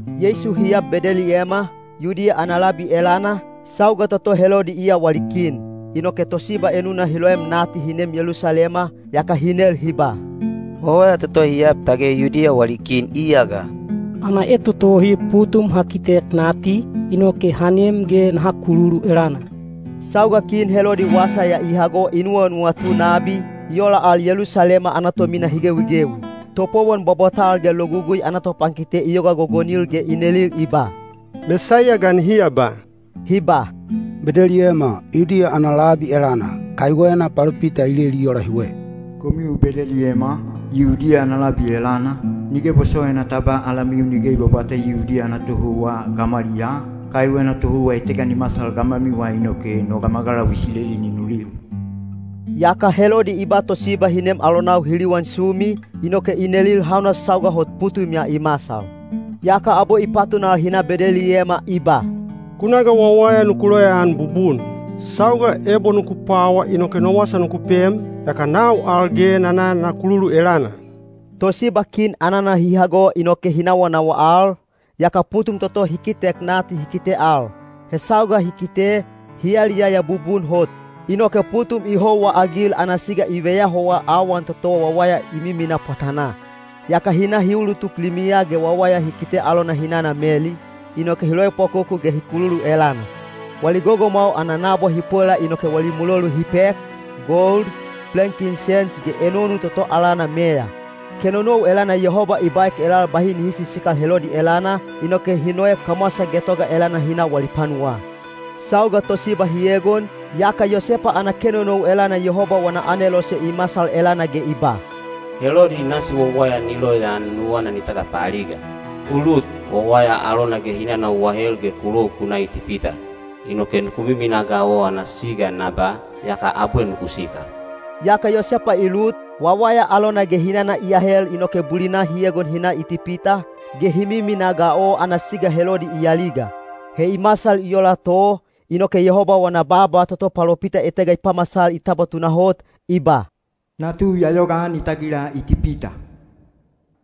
Yeisu hi ab Bedeliyema, Yudiya ana labi elana, sauga toto Helodi iya wali kin. Inoke tosiba enuna hi loem nati hi nem Yelusalema, yaka hi nel hi ba, “Wawaya toto hi ab tage Yudiya wali kin iya ga? Ana etotohi putum ha kitek nati, inoke ha nem ge naha kululu elana.” Sauga Kin Helodi wasa ya i hago i nuwanuwatu nabi, i ola al Yelusalema ana tomina hi gewigewi. Topowon bwabwatal ge Logugui ana topankite i yoga gogonil ge i nelil i ba, “Mesaiya ga nihi aba?” Hi ba, “Bedeliyema, Yudiya ana labi elana, kaiwena palopita i leli i ola hiwe: Komiu Bedeliyema, Yudiya ana labi elana, nige bosowaina ta ba alamiu nige i bwabwata Yudiya ana tohouwa gamwaliyaa, kaiwena tohouwa etega ni masal gamwamiwa inoke no gamagalau Isileli ni nulil.” Yaka Helodi i ba tosiba hi nem alonau hi liwan sumi, inoke i nelil hauna sauga hot putum ya i masal. Yaka abwe i patunal hi na Bedeliyema i ba, “Ku na ga wawaya nuku loyaan bubun. Sauga ebo nuku pwawa inoke no wasa nuku pem, yaka nau al ge na na na kululu elana.” Tosiba kin anana hi hago inoke hi nawanawa al, yaka putum toto hi kitek nati hi kite al. He sauga hi kite, hi yaliyaya bubun hot. Inoke putum i houwaagil ana siga i veyahowa awan toto wawaya i miminaa pwatanaa. Yaka hi na hi ulutuk limiya ge wawaya hi kite alona hinana Meli, inoke hi loepwakoku ge hi kululu elana. Wali gogomwau ana nabwa hi pwela inoke wali mulolu hi pek, gold, plenkinsens ge enonu toto alana meya. Kenonou elana Yehoba i baek elal bahi nihi sisikal Helodi elana, inoke hi noek kamwasa getoga elana hi na wali panuwaa. Sauga tosiba hi egon, yaka Yosepa ana kenonou elana Yehoba wana anelose i masal elana ge i ba, “Helodi nasi wawaya ni loyaan nuwana ni tagapaaliga. U lut, wawaya alona ge hinana u ahel ge ku lou ku na Itipita. Inoke nuku miminaa ga o ana siga na ba, yaka abwe nuku sikal.” Yaka Yosepa i lut, wawaya alona ge hinana i ahel inoke bulina hi egon hi na Itipita, ge hi miminaa ga o ana siga Helodi i aliga. He i masal i ola to, inoke Yehoba wana baaba toto palopita etega i pamasal i tabwa tunahot, i ba, “Natu ya yogaan i tagila Itipita.”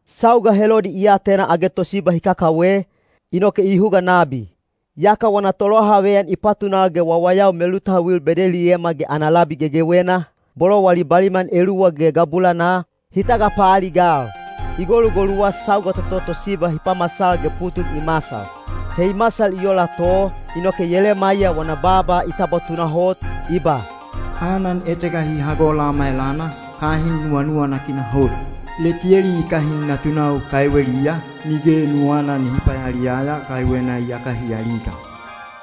Sauga Helodi i atena age tosiba hi kakawe, inoke i huga nabi. Yaka wana tolohaveyan i patunal ge wawayau melutauil Bedeliyema ge ana labi gegewena, bolo wali baliman eluwa ge gabulanaa, hi tagapaaligal. I golugoluwa sauga toto tosiba hi pamasal ge putum i masal. He i masal i ola to, inoke Yelemaiya wana baaba i tabwa tunahot, i ba: Anan etega hi hago Lama elana, kahin nuwanuwanakina hot. Letiyeli i kahin natunau kaiweliya, nige nuwana nihi payaliyaya kaiwena iyaka hi aliga.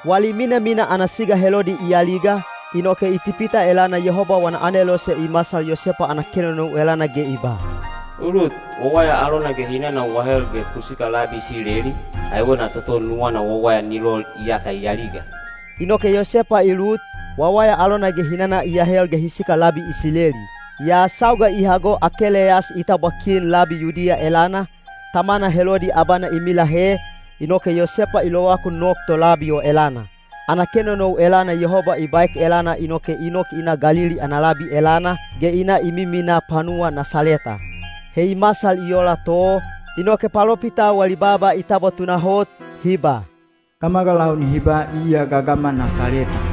Wali minamina ana siga Helodi i aliga, inoke Itipita elana Yehoba wana anelose i masal Yosepa ana kenonou elana ge i ba, “U lut, wawaya alona ge hinana u ahel ge ku sikal labi Isileli, kaiwena toto nuwana wawaya ni lol iyaka i aliga.” Inoke Yosepa i lut, wawaya alona ge hinana i ahel ge hi sikal labi Isileli. Yaa sauga i hago Akeleyas i tabwa kin labi Yudiya elana, tamana Helodi abana i milahe, inoke Yosepa i lovakun nok to labi o elana. Ana kenonou elana Yehoba i baek elana inoke i nok i na Galili ana labi elana, ge i na i miminaa panuwa Nasaleta. He i masal i ola to, inoke palopitau wali baaba i tabwa tunahot, hi ba, “Gamagalau nihi ba iya gagama Nasaleta.”